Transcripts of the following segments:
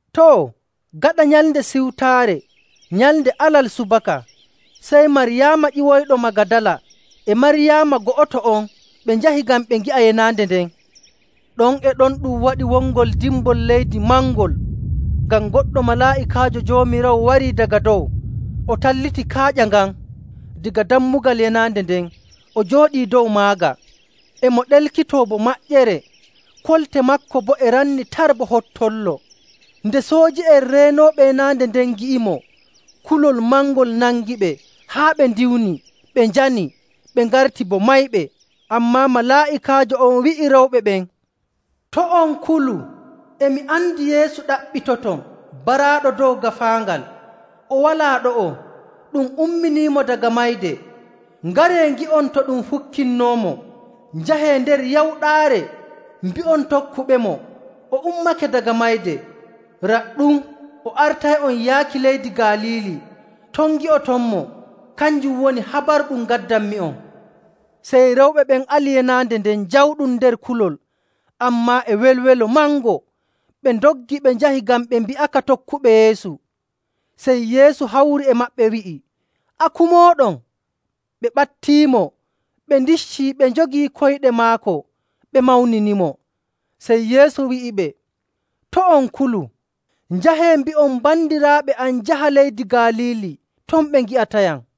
Too, gaɗa Nyalnde Siwtaare, nyalnde Alal subaka, sey Maryaama ƴiwoyɗo Magadala e Maryaama go'oto on ɓe njahi ngam ɓe ngi'a yenaande nden. Ɗon e ɗon ɗum waɗi wongol dimbol leydi mangol, ngam goɗɗo malaa'ikaajo Joomiraawo wari daga dow, o talliti kaaƴa ngan daga dammugal yenaande nden, o jooɗii dow maaga. E mo ɗelkitoo bo maƴƴere, kolte maako boo e ranni tar bo hottollo. Nde sooji'en reenooɓe yenaande nden ngi'imo, kulol mangol nangiɓe haa ɓe ndiwni, ɓe njani, ɓe ngarti bo mayɓe. Ammaa malaa'ikaajo on wi'i rewɓe ɓen, “To' on kulu. E mi andi Yeesu ɗaɓɓitoton, baraaɗo dow gaafaangal. O walaa ɗo'o. Ɗum umminiimo daga mayde. Ngaree ngi'on to ɗum fukkinnoomo. Njahee nder yawɗaare mbi'on tokkuɓemo, ‘O ummake daga mayde. Raɗɗum, o artay'on yaaki leydi Galiili. Ton ngi'otonmo.’ Kanjum woni habaru ɗum ngaddanmi'on.” Sey rewɓe ɓen ali yenaande nden jawɗum nder kulol, ammaa e welwelo mango. Ɓe ndoggi ɓe njahi ngam ɓe mbi'aka tokkuɓe Yeesu. Sey Yeesu hawri e maɓɓe, wi'i, “Aku mooɗon!” Ɓe ɓattiimo, ɓe ndiccii, ɓe njogii koyɗe maako, ɓe mawninimo. Sey Yeesu wi'iɓe, “To' on kulu. Njahee mbi'on bandiraaɓe am njaha leydi Galiili. Ton ɓe ngi'atayam.”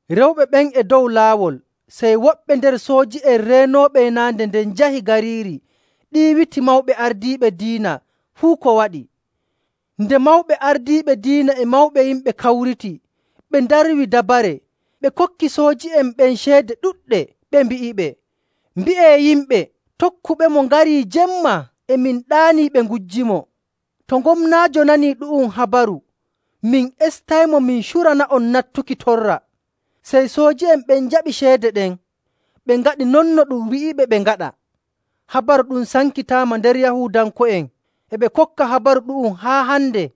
Rewɓe ɓen e dow laawol, sey woɓɓe nder sooji'en reenooɓe yenaande nden njahi gariiri ɗiiwiti mawɓe ardiiɓe diina fuu ko waɗi. Nde mawɓe ardiiɓe diina e mawɓe yimɓe kawriti, ɓe ndarwi dabare. Ɓe kokki sooji'en ɓen ceede ɗuɗɗe, ɓe mbi'iɓe, “Mbi'ee yimɓe, ‘Tokkuɓemo ngari jemma e min ɗaanii ɓe ngujjimo.’ To Gomnaajo nanii ɗu'um habaru, min estaymo min curana'on nattuki torra.” Sey sooji'en ɓen njaɓi ceede ɗen, ɓe ngaɗi non no ɗum wi'iɓe ɓe ngaɗa. Habaru ɗum sankitaama nder Yahuudanko'en, e ɓe kokka habaru ɗu'um haa hande.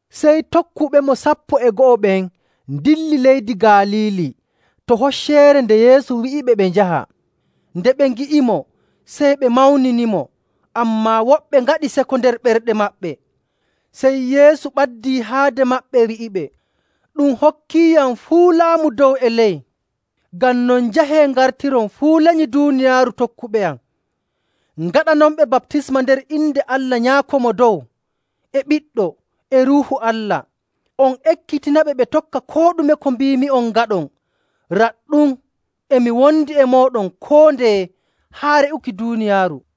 Sey tokkuɓemo sappo e go'o ɓen ndilli leydi Galiili to hocceere nde Yeesu wi'iɓe ɓe njaha.. Nde ɓe ngi'imo, sey ɓe mawninimo, ammaa woɓɓe ngaɗi seko nder ɓerɗe maɓɓe. Sey Yeesu ɓaddii haade maɓɓe, wi'iɓe, “Ɗum hokkiiyam fuu laamu dow e ley. Ngam non, njahee ngartiron fuu lenyi duuniyaaru tokkuɓeyam, ngaɗanonɓe baptisma nder inde Allah Nyaako Mo Dow, e Ɓiɗɗo, e Ruuhu Allah,. on ekkitinaɓe ɓe tokka koo ɗume ko mbiimi'on ngaɗon. Raɗɗum, e mi wondi e mooɗon koo ndeye haa re'uki duuniyaaru.”